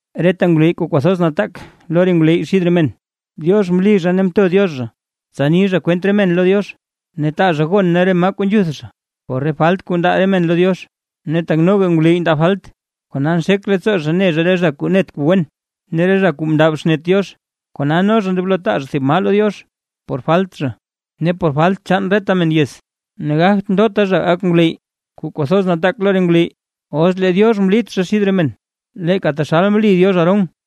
Reta ngwleyy kuu kwathoz nataak lo re ngwleyy xid re men, Diox mli zha ne mto Diox zha tsa ni zha kwent re men lo Diox, ne taa zha gon ne re maa kuu nzhuth zha por re falt kuu ndaa re men lo Diox. Ne tak noga ngwleyy ndaa falt, kona nxek leettsoo zha ne zha re zha kuu net kuu wen ne re zha kuu mndab xnet Diox; kona no zha ndoblo taa zha thib maa lo Diox por falt zha, ne por falt chaan reta men yez. Ne gagt ndota zha gak ngwleyy kuu kwathoz nataak lo re ngwleyy, os lee Diox mlit zha xid re men, leeka taxal mli Diox Aarón.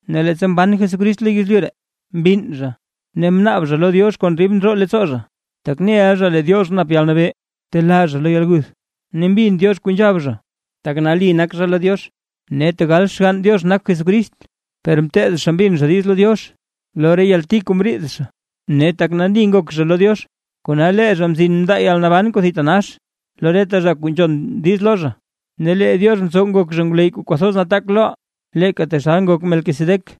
Ne leettsa mban Jesucrist lo yezlyu ree, mbinn zha, ne mnaab zha lo Diox kon dib ndroo leettsoo zha, tak neʼa zha lee Diox nap yalnabee telaa zha lo yalguth, ne mbin Diox kuu nzhab zha, tak nali nak zha lo Diox. Ne tegal Xgann Diox nak Jesucrist, per mteed zha mbin zha diiz lo Diox lo re yalti kuu mriid zha, ne tak nali ngok zha lo Diox, kona lee zha mzin mndaa yalnaban kuu thitanax lo reta zha kuu nzhon diiz lo zha, ne lee Diox mtsow ngok zha ngwleyy kuu kwathoz nataak loʼaa, leeka taxal ngok Melquisedec.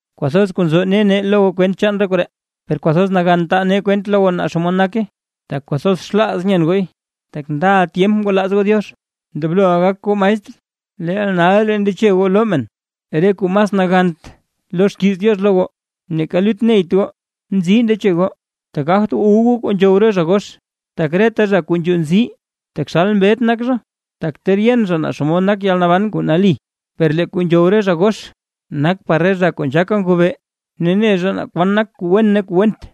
Kwathoz kuu nzo ne nee lo goo kwent chaan re koree, per kwathoz nagan taa nee kwent lo goo naa xomod nake, tak kwathoz xlaaz nyen gooy. Tak ndaʼa tyemp ngwalaaz goo Diox, ndobloʼa gak goo maestr, leel nalraa ndeche goo loo men, re kuu mas nagant lo xkiiz Diox lo goo. Neeka lut neyt goo, nzii ndeche goo, tak gagt wu goo re kuu nzhow zha gox. Tak reta zha kuu nzhuu nzii taxal mbet nak zha, tak ter yen zha naa xomod nak yalnaban kuu nali. Per lee kuu nzhow re zha gox, nak par re zha kuu nzhaaka ngobee ne ne zha naa kwan nak kuu wen ne kuu went.